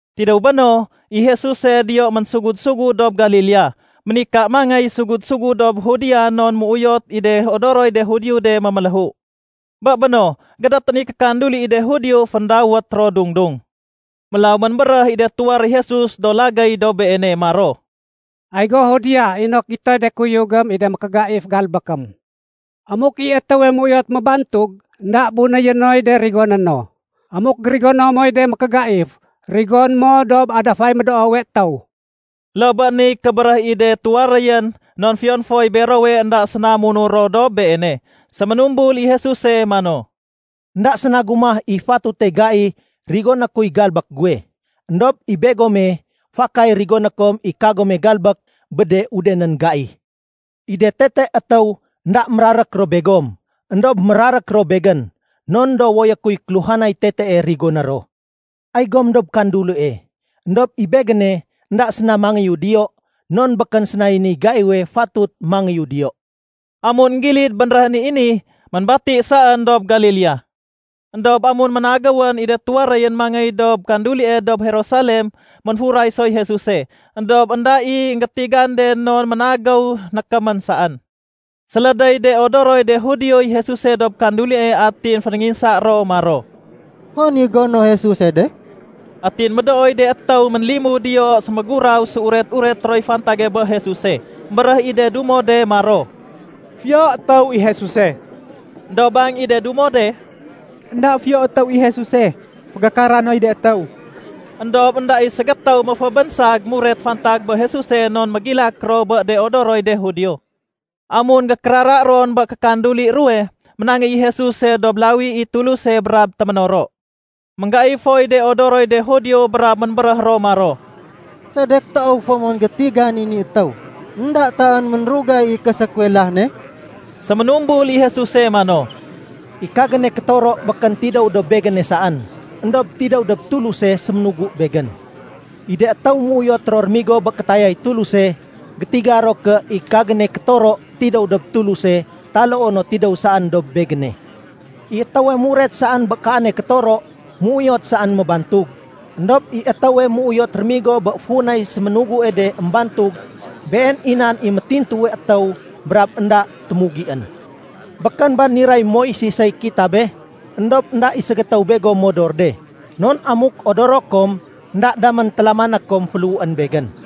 Tidéw béno, i Jesuse diyo ménsugud-sugud dob Galilea. Ménika mangéy sugud-sugud dob Judea non méuyot i de odoroy de Judio de méméléhu. Bé béno, gédétén i kékanduli i de Judio féndawét ro “Dung-dung.” Mélaw ménbéréh i de tuwaréy Jesus do lagéy dob Beene maro, “Ay go Judea inok gitoy de kuyugém i de mékégaif galbékém. Amuk i étéwe méuyot mébangtug, énda bunéyé noy de rigoné no. Amuk gérigono moy de mékégaif, rigoné mo dob adafay médoowe étéw.” (Loo bé niy kébéréh i de tuwaréyén non fiyon foy berowe énda séna munur ro dob Beene.) Séménumbul i Jesuse mano, “Enda séna gumah i fatute gai rigoné kuy galbék guwe. Endob i begome fakay rigoné kom i kagome galbék bé de udenén gai. I de tete étéw énda mérarék ro begom, éndob mérarék ro Begén non dowoyé kuy kéluhanay tetee rigoné ro. Ay gom dob kandulie, éndob i Begéne énda séna mangéyu diyo non békén sénay niy gaiwe fatut mangéyu diyo.” Amun énggilid bénréhén i ni, ménbati saén dob Galilea. Endob amun ménagéwén i de tuwaréyén mangéy dob kandulie dob Jerusalem, ménfuray soy Jesuse, éndob énda i énggétigan de non ménagéw nékémén saén. Sélédéy de odoroy de Judioy Jesuse dob kandulie atin fénénginsa ro maro, “Hon i gono Jesuse de?” Atin médooy de étéw ménlimud diyo séméguraw séuret-ureté roy fantage bé Jesuse. Embéréh i de dumo de maro, “Fiyo étéw i Jesuse.” Endob bang i de dumo de, “Enda fiyo étéw i Jesuse, fégakara noy de étéw.” Endob énda i ségétéw ménfébénsag muret fantag bé Jesuse non mégilak ro bé de odoroy de Judio. Amun gékérara ron bé kékanduli ruwe, ménangéy i Jesuse dob lawi i Tuluse brab téménoro. Ménggaif foy de odoroy de Judio brab ménbéréh ro maro, “Sedek toow fo mon gétigan i ni étéw, énda taén ménrugay i késékuwelah ne?” Séménumbul i Jesuse mano, “I kagéne kétoro békén tidéw dob Begéne saén, éndob tidéw dob Tuluse séménugu Begén. I de étéw méuyot ro rémigo bé kétayay Tuluse, gétiga ro ké i kagéne kétoro tidéw dob Tuluse taloo no tidéw saén dob Begéne. I étéwe muret saén bé kaane kétoro, méuyot saén mébantug. Endob i étéwe méuyot rémigo bé funay séménugue de émbantug, been i nan i métintuwe étéw brab énda témugién. Békén ba niray Moisesey kitabe? Endob énda i ségétéw begom modor de, non amuk odoro kom, énda damén télamané kom féléhuén Begén.”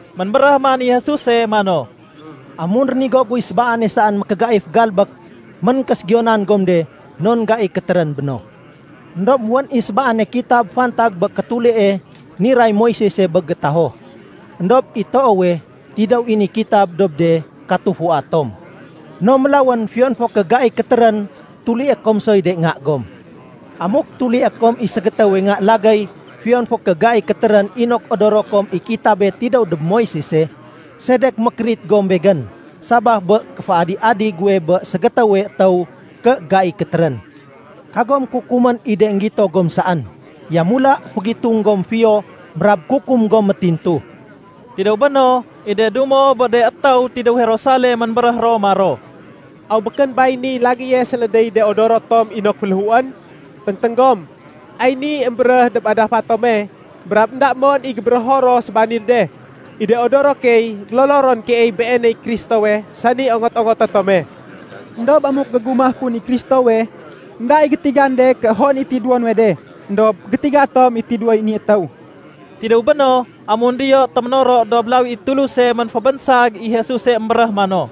Ménbéréh man i Jesuse mano, “Amun rénigo guy sébaane saén mékégaif galbék, ménkéségiyonan gom de non gai kétérén béno. Endob wén i sébaane kitab fantag bé kétulie niray Moisese bé gétaho. (Endob i toowe, tidéw i ni kitab dob de katufua tom.) No mélawén fiyon fo ké gai kétérén, tulié kom soy de nga gom. Amuk tulié kom i ségétéwe nga lagéy fiyon fo ké gai kétérén inok odoro kom i kitabé tidéw dob Moisese, sedek mékérit gom Begén sabaf bé kéféadi-adi guwe bé ségétéwe étéw ké gai kétérén? Kagom kukumén i de énggito gom saén. Yamula fégitung gom fiyo brab kukum gom métintu.” Tidéw béno, i de dumo bé de étéw tidéw Jerusalem ménbéréh ro maro, “Aw békén bay niy lagéye sélédéy de odoro tom inok féléhuén? Téngténg gom, ay ni émbéréh dob adafa tome brab énda mon i gébérého ro sébanil de. I de odoro key, gélolo ron keey Beeney Kristowe sani ongot-ongoté tome. Endob amuk gégumah kun i Kristowe, énda i gétigan de ké hon i tidéwo nuwe de. Endob gétiga tom i tidéwoy ni étéw.” Tidéw béno, amun diyo téménoro dob lawi i Tuluse ménfébénsag i Jesuse émbéréh mano,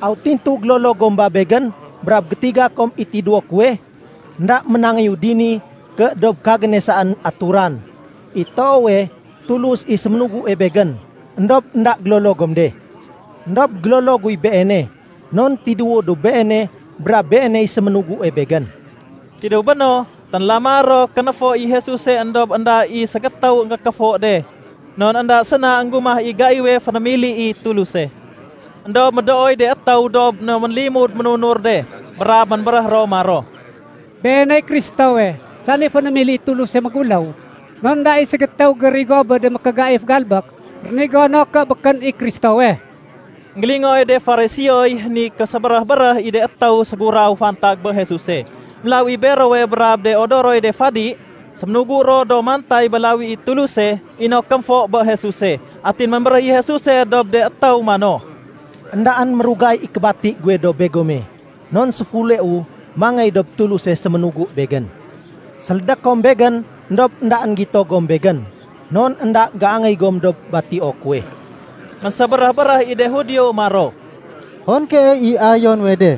“Aw tintu gélolo gom ba Begén brab gétiga kom i tidéwo kuwe? Enda ménangéyu dini ké dob kagéne saén aturan. I toowe Tulus i séménugue Begén, éndob énda gélolo gom de. Endob gélolo guy Beene, non tidéwu dob Beene brab Beeney séménugue Begén.” Tidéw béno, ténlama ro kénéfo i Jesuse éndob énda i ségétew énggékéfo de non énda séna énggumah i gaiwe fénémili Tuluse. Endob médooy de étéw dob de ménlimud ménunur de, brab ménbéréh ro maro, “Beeney Kristowe, sani fénémili i Tuluse méguléw, non énda i ségétéw gérigo bé de mékégaif galbék rénigo no ké békén i Kristowe.” Enggélingooy de Fariseoy ni késébéréh-béréh i de étéw séguraw fantag bé Jesuse. Mélaw i berowe brab de odoroy de fadi, séménugu ro do mantay bé lawi i Tuluse inok kémfo bé Jesuse. Atin ménbéréh i Jesuse dob de étéw mano, “Endaén mérugay i kébati guwe dob begome non séfuleu mangéy dob Tuluse séménugu Begén. Sélédé kom Begén éndob éndaén gito gom Begén, non énda géangéy gom dob batio kuwe.” Ménsébéréh-béréh i de Judio maro, “Hon keey i ayo nuwe de,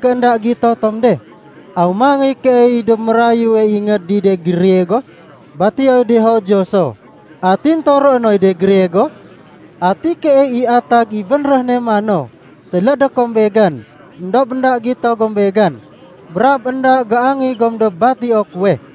ké énda gito tom de? Aw mangéy keey dob mérayue ingéd i de Griego batioy de Judio so, atin toroé noy de Griego? Ati keey i atag i bénréh ne mano, ‘Sélédé kom Begén, éndob énda gito gom Begén, brab énda géangéy gom dob batio kuwe?’”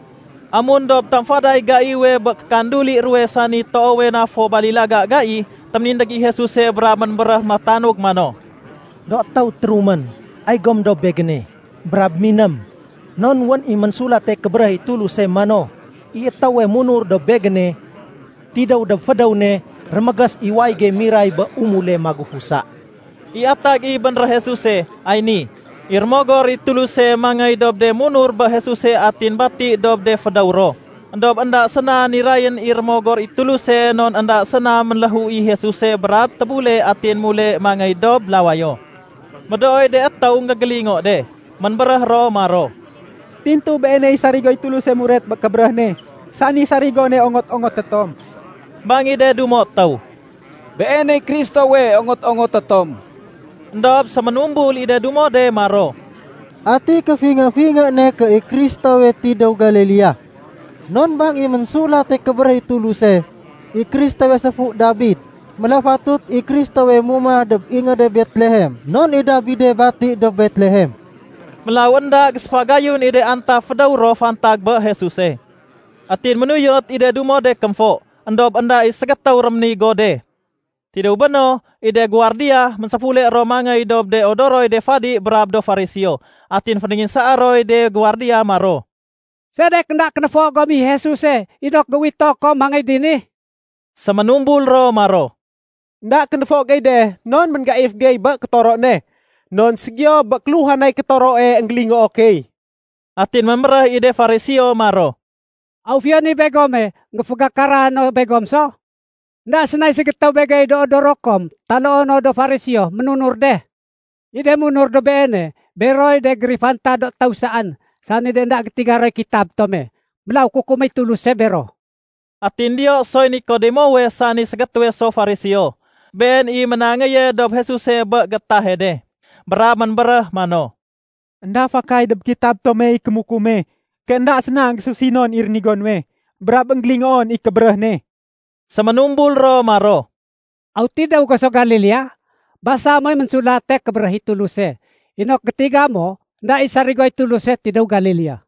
Amun dob tamfaday gaiwe bé kékanduli ruwe sani toowe na fo balilaga gai, téménindég i Jesuse brab ménbéréh métanug mano, “Do étéw térumén, ay gom dob Begéne, brab miném. Non wén i Ménsulate Kébéréh i Tuluse mano, ‘I étéwe munur dob Begéne, tidéw dob fédéw ne rémégés i wayége miray bé umule magufusa.’” I atag i bénréh Jesuse, ay ni: i Rémogor i Tuluse mangéy dob de munur bé Jesuse atin bati dob de fédéw ro. Endob énda séna nirayén i Rémogor i Tuluse non énda séna ménléhu i Jesuse brab tébule atin mule mangéy dob lawayo. Médooy de étéw énggégélingo de, ménbéréh ro maro, “Tintu Beeney sarigoy Tuluse muret bé kébéréh ne, sani sarigone ongot-ongoté tom.” Bang i de dumo étéw, “Beeney Kristowe ongot-ongoté tom.” Endob séménumbul i de dumo de maro, “Ati kéfingé-fingé ne ké i Kristowe tidéw Galilea? Non bang i Ménsulate Kébéréh i Tuluse, i Kristowe séfu Dabid. Mélaw fatut i Kristowe mumah dob ingéde Betlehem non i Dabide bati dob Betlehem.” Mélaw énda géséfagayun i de antaf fédéw ro fantag bé Jesuse. Atin ménuyot i de dumo de kémfo, éndob énda i ségétéw réménigo de. Tidéw béno, i de guwardiya ménséfule ro mangéy dob de odoroy de fadi brab do Fariseo. Atin fénénginsaa roy de guwardiya maro, “Sedek énda kénéfo gom i Jesuse inok géuwito kom mangéy dini?” Séménumbul ro maro, “Enda kénéfo gey de non ménggaif gey bé kétoro ne. Non ségiyo bé kéluhanay kétoroe énggélingoo key.” Atin ménbéréh i de Fariseo maro, “Aw fiyon i begome, énggéfégakara no begom so? Enda sénay ségétéw begey do odoro kom taloo no do Fariseo ménunur de. I de munur dob Beene, beroy de gérifantad étéw saén, sani énda gétiga roy kitab tome. Mélaw kukuméy Tuluse bero.” Atin diyo soy Nikodemowe sani ségétéwe so Fariseo. Been i ménangéye dob Jesuse bé gétahe de. Brab ménbéréh mano, “Enda fakay dob kitab tomey kémukume ké énda séna énggésusinon i rénigo nuwe, brab énggélingoon i kébéréh ne.” Séménumbul ro maro, “Aw tidéw go so Galilea? Basa moy Ménsulate Kébéréh i Tuluse, inok gétiga mo énda i sarigoy Tuluse tidéw Galilea.”